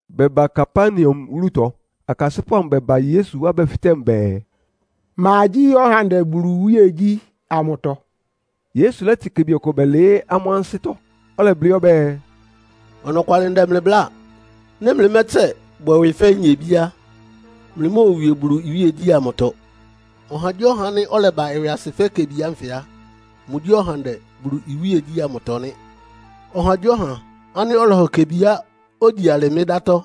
Bɛba Kapernaum wúlutɔ, akasɩ́pʋ́ amʋ bɛba Yesu wá bɛfɩtɛ́ mʋ bɛɛ, “Ma gyí ɔhandɛ Bulu iwíegyí ámʋtɔ?” Yesu lɛ́tɩ kebi ɔkʋ bɛlɩɩ́ amʋ́ ansɩ́tɔ́, ɔlɛblɩ́ ɔbɛ́ɛ, “Ɔnɔkwalɩ ndɛ mlɩ bláa. Nɩ́ mlɩmɛ́tsɛ, bwɛ ɩwɩ fɛ́ nyebí á, mlɩmóowie Bulu iwíegyí ámʋtɔ. Ɔhagyíɔha ánɩ́ ɔlɛba ɩwɩasɩ fɛ́ kebi ánfɩ á, mʋgyí ɔhandɛ Bulu iwíegyí ámʋtɔ nɩ́. Ɔhagyíɔha ánɩ́ ɔlɔhɔ kebiá ogyi alɩ mɩ́ dátɔ́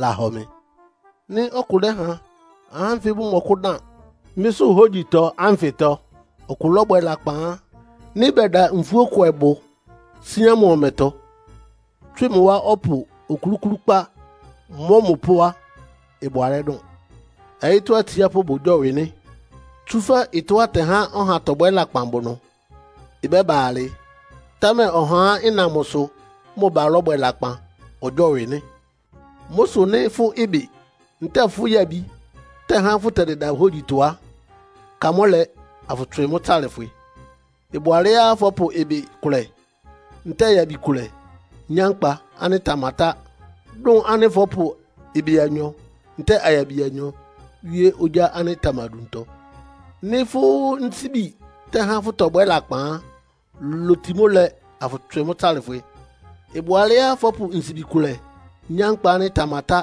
lahɔ mɩ. “Nɩ́ ɔkʋ lɛ́ha ahá ánfɩ bʋmɔkʋ́dan mɩ́sʋ́ hógyitɔ ánfɩtɔ ɔkʋ lɔ́bwɛ lakpan á, nɩ́ bɛda nfúókwɛbʋ síán mʋ ɔmɛtɔ, tswɩ mʋ wá ɔpʋ okluklúkpá, mɔ́ mʋ pó á, ɩbʋ alɛ́ dʋn. Ɔyɩ́tɔ́ atsiápʋ́ bʋgyɔ́wɩ nɩ́. Tsúfɛ́ ɩtɔ́á ɩtɛhá ɔha tɔbwɛ́ lakpan bʋ ɩnʋ. Ɩbɛ́ba alɩ, támɛ ɔhá ánɩ́ ɩna mʋsʋ mʋ ba lɔ́bwɛ lakpan ɔgyɔ́wɩ nɩ́. “Mʋ́ sʋ nɩ́ fʋ́ ɩbɩ ntɛ́ɛ fʋ́ yabi tɛ́há fʋtɛdɩda hógyitɔ á, ka mʋ́ lɛ, afʋtswɩ mʋ́ tsalɩfwɩ. Ɩbʋ alɛ́á fɔ́pʋ ɩbɩ kʋlɛ ntɛ́ɛ yabi kʋlɛ nyá nkpa ánɩ́ ɩtamatá, dʋn ánɩ́ fɔ́pʋ ɩbɩ anyɔ ntɛ́ɛ ayabi anyɔ wíé ogyá ánɩ́ ɩtamaduntɔ. Nɩ́ fʋ́ nsíbi tɛ́há fʋ́tɔbwɛ́ lakpan á, loti mʋ́ lɛ, afʋtswɩ mʋ́ tsalɩfwɩ. Ɩbʋ alɛ́á fɔ́pʋ nsibi kʋlɛ nyá nkpa ánɩ́ ɩtamatá,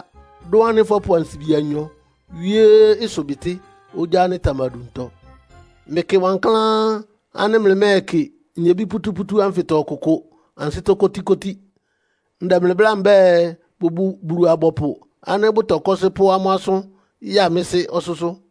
dʋn ánɩ́ fɔ́pʋ ansibi anyɔ wíé ɩsʋbɩtɩ́ ogyá ánɩ́ ɩtamaduntɔ. “Mlɩkɩ wankláán ánɩ́ mlɩmɛ́ɛkɩ nyebí pútúpútú ánfɩtɔ ɔkʋkʋ ansɩ́tɔ́ kótíkótí. Ndɛ mlɩ bláa mbɛ́ɛ, bʋbʋ Bulu-abɔpʋ ánɩ́ bʋtɔkɔ́sɩ́ pʋ́ amʋ́ asʋ́n ya mɩ́ Sɩ́ ɔsʋ́sʋ́.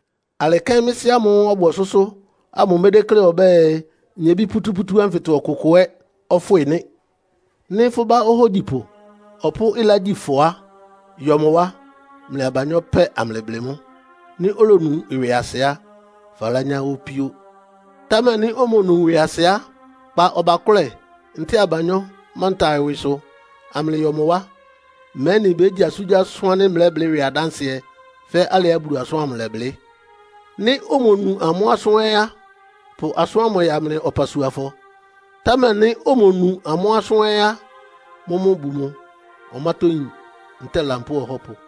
Alɩ kɛ́n mlɩ Sɩ́ ámʋ́ʋ́ ɔbʋ ɔsʋ́sʋ́ ámʋ médékle ɔbɛ́ɛ, nyebí pútúpútú ánfɩtɔ ɔkʋkʋ ɛ́ ɔfwɩ́ nɩ́. “Nɩ́ fʋ́ bá ohógyipʋ ɔpʋ́ ɩlá gyi fʋ á, yɔ mʋ wá, mlɩ abanyɔ́ pɛ́ amlɩblɩ mʋ́. Nɩ́ olonu ɩwɩasɩ á, falányá opíó. Támɛ nɩ́ omonu ɩwɩasɩ á, kpa ɔbakʋ́lɛ ntɛ́ɛ abanyɔ́ manta ɩwɩsʋ amlɩyɔ mʋ wá, mɛ́nɩ bégyi asʋ́ngyíasʋ́n ánɩ́ mlɛ́blɩ́ ɩwɩ adánsɩɛ fɛ́ alɩá Bulu asʋ́n lɛblɩ́. Nɩ́ omonu amʋ́ asʋ́n ɛ́ á, pʋ asʋ́n ámʋ ya mlɩ ɔpasuafɔ. Támɛ nɩ́ omonu amʋ́ asʋ́n ɛ́ á, mʋ́mʋ́ bu mʋ ɔmátɔ́yín ntɛ́ɛ lampóo ɔhɔ́pʋ.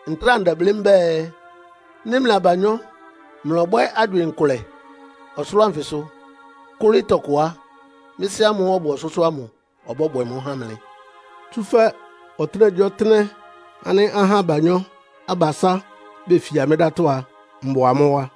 “Ntráa ndɛblɩ́ mbɛ́ɛ, nɩ́ mlɩ abanyɔ́ mlɔbwɛ́ agywɩɩn kʋlɛ ɔsʋlʋ́ʋ anfɩsʋ kʋ́lɩ́ tɔkʋ á, mɩ́ Sɩ́ ámʋ́ʋ́ ɔbʋ ɔsʋ́sʋ́ ámʋ ɔbɔ́bwɛ mʋ́ há mlɩ. Tsúfɛ́ ɔtɩ́nɛgyíɔtɩ́nɛ́ ánɩ́ ahá abanyɔ́-abasá befia mɩ́ dátɔ́ á, mbʋ amʋ́ wá.”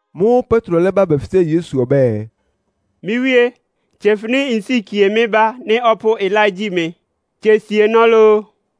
Mʋ́ʋ́ Petro lɛ́ba bɛfɩtɛ́ Yesu ɔbɛ́ɛ, “Mɩ́ Wíé, tsefɩnɩ nsíkie mɩ́ bá nɩ́ ɔpʋ́ ɩlá gyi mɩ? Tse sienɔ́ lóó?”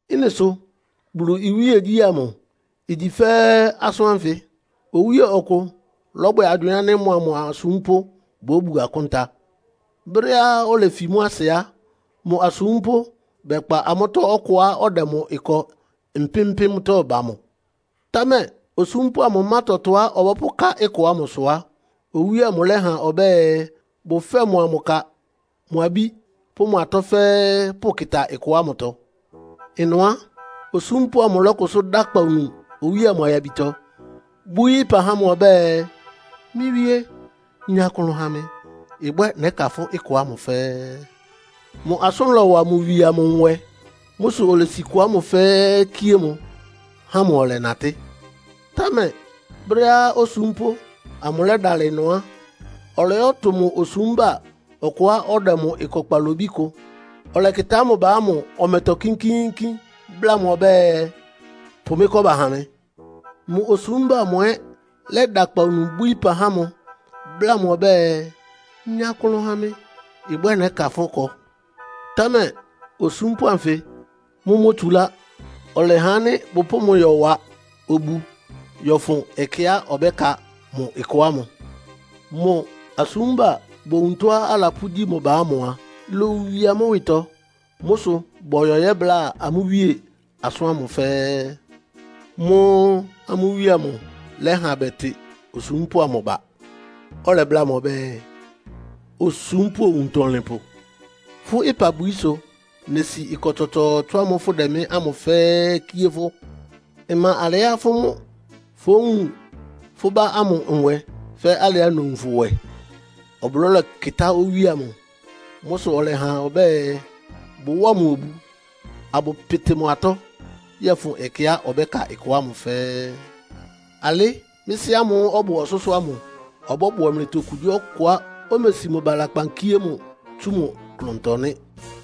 Ɩ́nɩ sʋ Bulu iwíegyí ámʋ igyi fɛ́ asʋ́n ánfɩ. Owíe ɔkʋ lɔ́bwɛ agywɩɩn ánɩ́ mʋa mʋ asúmpʋ́ bóbu akúnta. Brɛ́á olefi mʋ́ asɩ á, mʋ asúmpʋ́ bɛkpa amʋ́tɔ́ ɔkʋá ɔdɛ mʋ ɩkɔ mpɩ́m-mpɩ́mtɔ́ ba mʋ. Támɛ osúmpʋ́ amʋ má tɔtɔá ɔbɔ́pʋká ɩkɔ ámʋ sʋ á, owíe amʋ lɛ́ha ɔbɛ́ɛ bʋfɛ́ɛ mʋa mʋ ka, mʋ abí pʋ́ mʋ atɔ́ fɛ́ɛ́ pʋ́kɩ́tá ɩkɔ ámʋtɔ. Ɩnʋ á, osúmpʋ́ amʋ lɔ́kʋsʋ́ dá akpawunu owíe amʋ ayabitɔ, bwíí ɩpa há mʋ ɔbɛ́ɛ, ‘Mɩ́ Wíé, nya klʋn ha mɩ. Ɩbwɛ́ nɛ́ka fʋ́ ɩkɔ ámʋ fɛ́ɛ́.’ Mʋ asʋ́n lɔwa mʋ wie amʋ nwɛ. Mʋ́ sʋ olesi ɩkɔ ámʋ fɛ́ɛ́ kíé mʋ, há mʋ ɔlɛnatɩ́. “Támɛ brɛ́á osúmpʋ́ amʋ lɛ́dalɩ ɩnʋ á, ɔlɔyɔ́tʋ mʋ osúmba ɔkʋá ɔdɛ mʋ ɩkɔ kpalobí kʋ. Ɔlɛkɩtá mʋ ba ámʋ ɔmɛtɔ kínkíínkín, bláa mʋ ɔbɛ́ɛ, ‘Pʋ mɩ́ kɔ́ba ha mɩ!’ Mʋ osúmba amʋ ɛ́ lɛ́da akpawunu bwíí ɩpa há mʋ, bláa mʋ ɔbɛ́ɛ, ‘Nya klʋn ha mɩ. Ɩbwɛ́ nɛ́ka fʋ́ kɔ.’ Támɛ osúmpʋ́ anfɩ mʋ́ mótsulá. Ɔlɛha ánɩ́ bʋpʋ́ʋ mʋ yɔwa obu yɔ́fʋn ɛkɛá ɔbɛ́ka mʋ ɩkɔ ámʋ. Mʋ asúmba bowun tɔ́á alapʋ́gyi mʋ ba ámʋ a, ilowie amʋ́ ɩwɩtɔ. Mʋ́ sʋ bɔyɔ yɛ́bláa amʋ́ wíe asʋ́n ámʋ fɛ́ɛ́. Mʋ́ʋ́ amʋ́ wíe amʋ lɛ́ha bɛtɩ osúmpʋ́ amʋ ba, ɔlɛbláa mʋ ɔbɛ́ɛ, ‘Osúmpʋ́ owuntɔlɩnpʋ, fʋ́ ɩpabwií sʋ nesi ɩkɔ tsɔtsɔɔtsɔ ámʋ́ʋ́ fʋ́dɛ mɩ́ ámʋ fɛ́ɛ́ kíé fʋ́. Ɩma alɛá fʋ́ mʋ́ fówun fʋ́ bá ámʋ nwɛ fɛ́ alɩá nowun fʋ nwɛ?’ Ɔblɔ́ lɛkɩtá owíe amʋ. Mʋ́ sʋ ɔlɛha ɔbɛ́ɛ, bʋwáa mʋ obu, abʋpɩtɩ mʋ atɔ́ yɔ́fʋn ɛkɛá ɔbɛ́ka ɩkɔ ámʋ fɛ́ɛ́. “Alɩ́ mɩ́ Sɩ́ ámʋ́ʋ́ ɔbʋ ɔsʋ́sʋ́ ámʋ ɔbɔ́bwɛ mlɩtɔ okugyíɔkʋá omesi mʋ ba lakpan kíé mʋ tsú mʋ klʋntɔ nɩ́.”